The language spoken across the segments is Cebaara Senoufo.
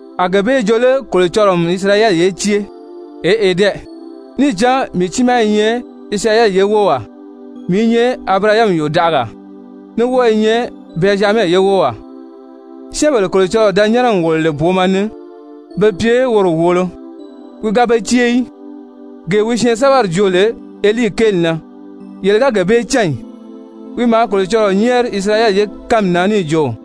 A gee bee jo lé Kolocɔlɔɔ n Isirayɛli ye cée? Eʔe dɛ! Níì cán mii tiimaa i nyɛ Isirayɛli ye wówaa, mii i nyɛ Abirahami yòdaʔagaa, ní wɔ́ɔ i nyɛ Bɛnzyamɛ ye wówaa. Syɛ́ɛnbèle Kolocɔlɔɔ da nyɛ́nɛ n wòlo lè booma ni be pye woro wòolo, wi ga be cée í. Gee wi syɛɛnsɛbɛri joo lè Elii kéeli na, yele ga gee bee cán ì? Wi maa Kolocɔlɔɔ nyɛ́ɛri Isirayɛli ye kánmi na níì jo: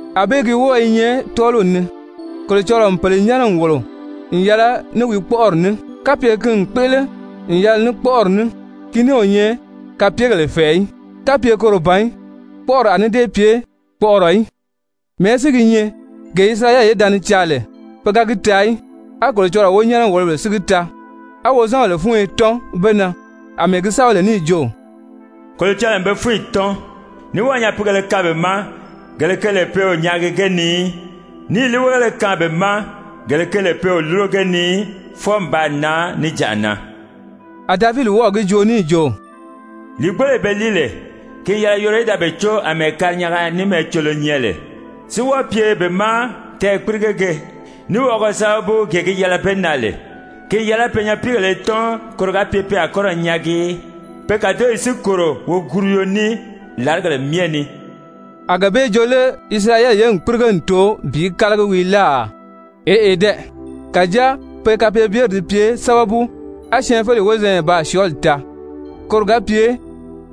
Anbée gi wɔ́ɔ i nyɛ tɔ́ɔliw ni, Kolocɔlɔɔ n pèle nyɛ́nɛ n wòlo n yɛlɛ ní wi kpɔ́ʔɔri ní. Kapye ki n kpéʔele n yɛlɛ ní kpɔ́ʔɔri ní, ki ní o nyɛ kapyegèle fɛ̀ɛ í. Kapye koro ban í, kpɔ́ʔɔri a ní dée pye kpɔʔɔrɔ í. Mɛ̀ɛ́ si gi nyɛ? Gee Isirayɛli ye da ni caa lè, pe ga gi taa í, á Kolocɔlɔɔ wonyɛnɛ-wòlobèle si gi taa, á wozanbèle fúnyo tɔ́n be na. Amɛɛ gi sɛ́bɛ lè níì jo: «Kolocɔlɔɔ n be fúnyi tɔ́n, ní wɔ́ɔ̀ nyapiigèlē kaan be ma, gele ge lè pe o nyaagi ge ni í, níì líiweegéle kaan be ma, gele ge lè pe o lúro ge ni í, fwɔɔ n baa nan níjanʔa na.» A Davidi wɔ́ɔ̀ gi joo níì jo: «Lìigboloyi be líi lè, ki n yɛlɛ yoro í da be có àmɛɛ karinyanga ní mɛɛcolo nyɛ lè, si wɔ́ɔ pye be ma tɛɛ̀kpirigege, ní wɔʔɔgɔ sábabu gee gi yɛlɛ be na lè. Ki n yɛlɛ pe nyapiigèle í tɔ́n koro ga pye pe a kɔ́ ra nyaagi í, pe kàdoyi si kòro woguruyo ní làrigèle myɛ ni.» A gee bee jo lé Isirayɛli ye n kpírige n too bi kálagi wii láà? Eʔe dɛ! Kàjáa pe kapeebyeri di pye sábabu, á syɛɛnfeleyi wozanya baa syɔɔli taa, koro ga pye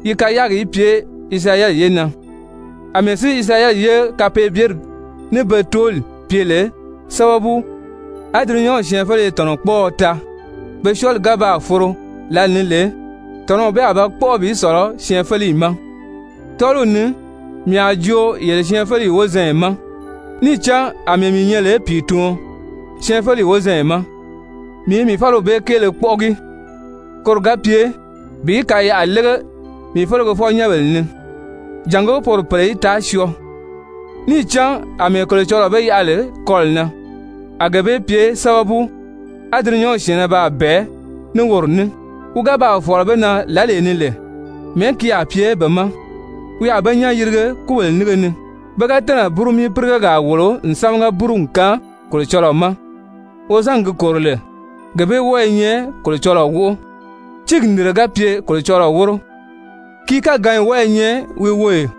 yi kayaagi í pye Isirayɛli ye na. Amɛɛ si Isirayɛli ye kapeebyeri ní be tooli pye lè sábabu, á dulunyanw syɛɛnfeleye tɔ̀nɔkpɔɔɔ taa, pe syɔɔli ga baa foro lǎlee ni lè, tɔ̀nɔw bee a ba kpɔ́ʔɔ bi sɔ̀lɔ syɛɛnfeleyi ma. Tɔ́ɔliw ni mii a joo yele syɛɛnfeleyi wozanya ma, níì cán àmɛɛ mii nyɛ lè pìituɔn syɛɛnfeleyi wozanya ma, mii i mii fáliw bee kéele kpɔ́ʔɔgi, koro ga pye bi kayaʔa lége mii felegefɔ-nyɛ́nbèle ni, jàngó poro pèle í taa syɔɔ. Níì cán àmɛɛ Kolocɔlɔɔ be yaʔa lè kɔlɔ̀ na, a gee bee pye sábabu, á dulunyanw syɛ̀ɛnnɛ baa bɛ̀ɛ ní woro ní, wi ga baa fɔ̀lɔ be na lǎlee ni lè, mɛ̀ɛ́ ki a pye be ma? Wi a be nyán yirige kúbèle nínge ni. Pe ga tɛ́nɛ̀ búrumii-pírigegaa wòlo n sámaga búru n kaan Kolocɔlɔɔ ma, wozangi gi kòro lè, gee bee wɔ́ɔ i nyɛ Kolocɔlɔɔ wóʔo. Tíigi nìnre ga pye Kolocɔlɔɔ wóro, ki káganyi wɔ́ɔ i nyɛ wi woyò.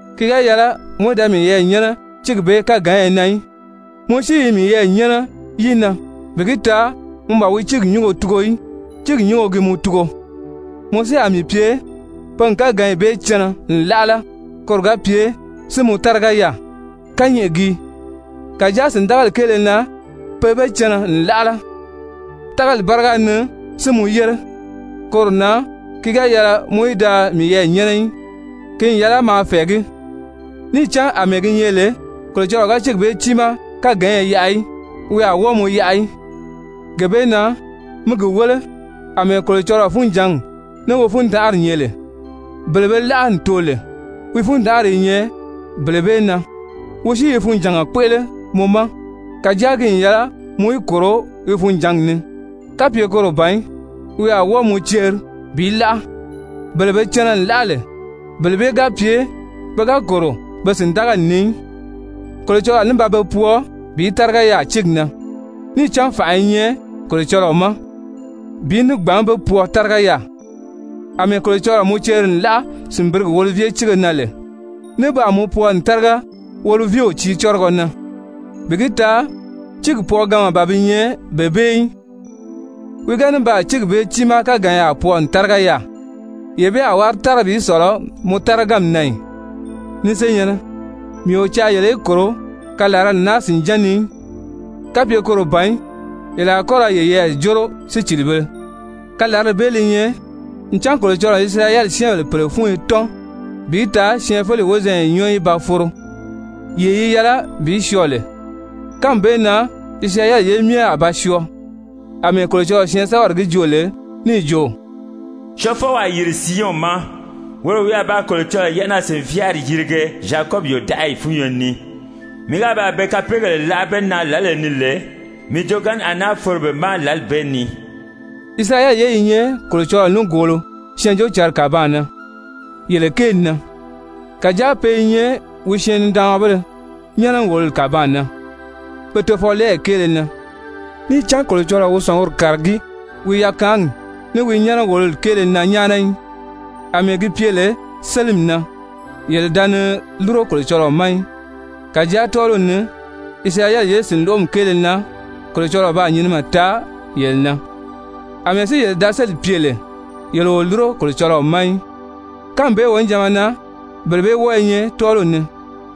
ki ga yɛlɛ mɔ í da miyɛɛ nyɛ́nɛ tíigi bee káganya na í. Mɔ si i miyɛɛ nyɛ́nɛ yi na bi gi taa mɔ ban wi tíigi nyúngo tugo í, tíigi nyúngo gi mɔ tugo. Mɔ si a mii pye pe n káganyi bee cɛnɛ n láʔala koro ga pye si mɔ táriga yaà. Kányɛʔɛ gii. Kàjáa sìndagali kéele na pe be cɛnɛ n láʔala, tágali báriga ni si mɔ yére. Koro na ki ga yɛlɛ mɔ í da miyɛɛ nyɛ́nɛ í, ki n yɛlɛ maa fɛ̀ɛgí. Níì cán àmɛɛ gi nyɛ lè Kolocɔlɔɔ ga tíigi bee tiimaa káganya yaʔa í, wi a wɔ́ɔ mɔ yaʔa í. Gee bee na mi gi wéle àmɛɛ Kolocɔlɔɔ funjǎngi ní wi fundanʔari nyɛ lè, bele be láʔa n too lè, wi fundanʔari i nyɛ bele bee na, wi si i funjànga kpéʔele mɔ ma, kàjáa ki n yɛlɛ mɔ í kòro wi funjǎngi ni. Kapye koro ban í, wi a wɔ́ɔ mɔ ceri bi láʔa. Bele be cɛnɛ n láʔala lè, bele bee ga pye pe ga kòro be sìndagali ni í, Kolocɔlɔɔ a ní ba be pwɔɔ bi táriga yaà tíigi na. Níì cán fànʔa i nyɛ Kolocɔlɔɔ ma bi ní gbǎn be pwɔɔ táriga yaà. Amɛɛ Kolocɔlɔɔ mɔ ceri n láʔa sìnbirigi olivye tíige na lè, ní baa mɔ pwɔɔ n táriga olivyew tiicɔ́rɔgɔ na, bi gi taa tíiri pwɔɔganma ban bi nyɛ bee bee í, wi ga ní baa tíigi bee tiimaa káganya pwɔɔ n táriga yaà, yee bee a wári tára bi sɔ̀lɔ mɔ táraganmi na ì? Ni senyɛ̀nnɛ, mii o caa yele í kòro kalarali naa sìnján ni í, kapye koro ban í, yele a kɔ́ ra yeyɛɛ jóro sícilibēle, kalarali bee li nyɛ ncan Kolocɔlɔɔ n Isirayɛli syɛ́ɛnbèle pèle fúnyo tɔ́n bi taa syɛɛnfeleyi wozanya nyɔ́ɔ í ba foro yee yi yɛlɛ bi syɔɔ lè. Kánmi bee na Isirayɛli ye myɛ a ba syɔɔ, àmɛɛ Kolocɔlɔɔ syɛɛnsɛbɛri gi joo lè níì jo: «Syɔɔfɔw a yìri Siyɔn ma, woro wi a ba Kolocɔlɔɔ yɛ́ʔɛnaa-sìnvyaari yirige Zyakɔbi yòdaʔayi fúnyo ni. Mii ga baa be kapeegèle láʔa be na lǎlee ni lè, mii joogaanni a náa foro be ma lǎli bee ni.» Isirayɛli ye i nyɛ Kolocɔlɔɔ nígoolo Syɛɛnjóocǎnri kàbaan na yele kéeli na. Kàjáa pe i nyɛ wi syɛɛn-nidaanmabéle nyɛ́nɛ-wòloli kàbaan na pe tofɔlɛɛyi kéele na. Níì cán Kolocɔlɔɔ o wi sɔ̀nguri kàragí wi yakaanyi ní wi nyɛ́nɛ-wòloli kéele na nyáana í. Amɛɛ gi pye lè sélimi na yele da ni lúro Kolocɔlɔɔ ma í, kàjáa tɔ́ɔliw ni Isirayɛli ye sìnloʔomi kéele na Kolocɔlɔɔ baa nyinimɛ taa yele na. Amɛɛ si yele da sélì pye lè, yele o lúro Kolocɔlɔɔ ma í, kánmi bee wonijanma na bele bee wɔ́ɔ̄ nyɛ tɔ́ɔliw ni,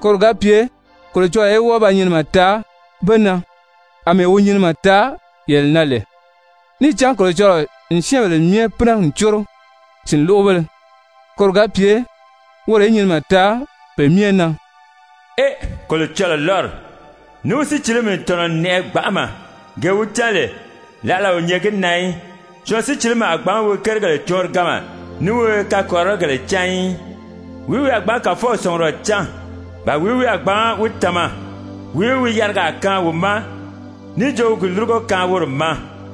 koro ga pye Kolocɔlɔɔ í wɔ́ɔ ba nyinimɛ taa be na, àmɛɛ wi nyinimɛ taa yele na lè. Níì cán Kolocɔlɔɔ n syɛ́ɛnbèle myɛ pínɛ n córo sìnloʔobéle, koro ga pye woro í nyinimɛ taa pe myɛ na. Ee, Kolocɔlɔɔ lɔ́ri, ní wi sícilimi n tɔ̀nɔ n nɛʔɛ gbanʔama, gee wi cán lè, láʔala o nyɛ gi na í! Syɔɔn sícilimi a gbǎn wi kérigèle cɔɔnriganma ní wi kakɔrirɔgèle cán í. «Wìí wi a gbǎn Kàfɔw sɔ̀ngurɔ cán? Ba wìí wi a gbǎn wi tama? Wìí wi yarigaa kaan wi ma níì jo wi ní gi lúrugo kaan woro ma?»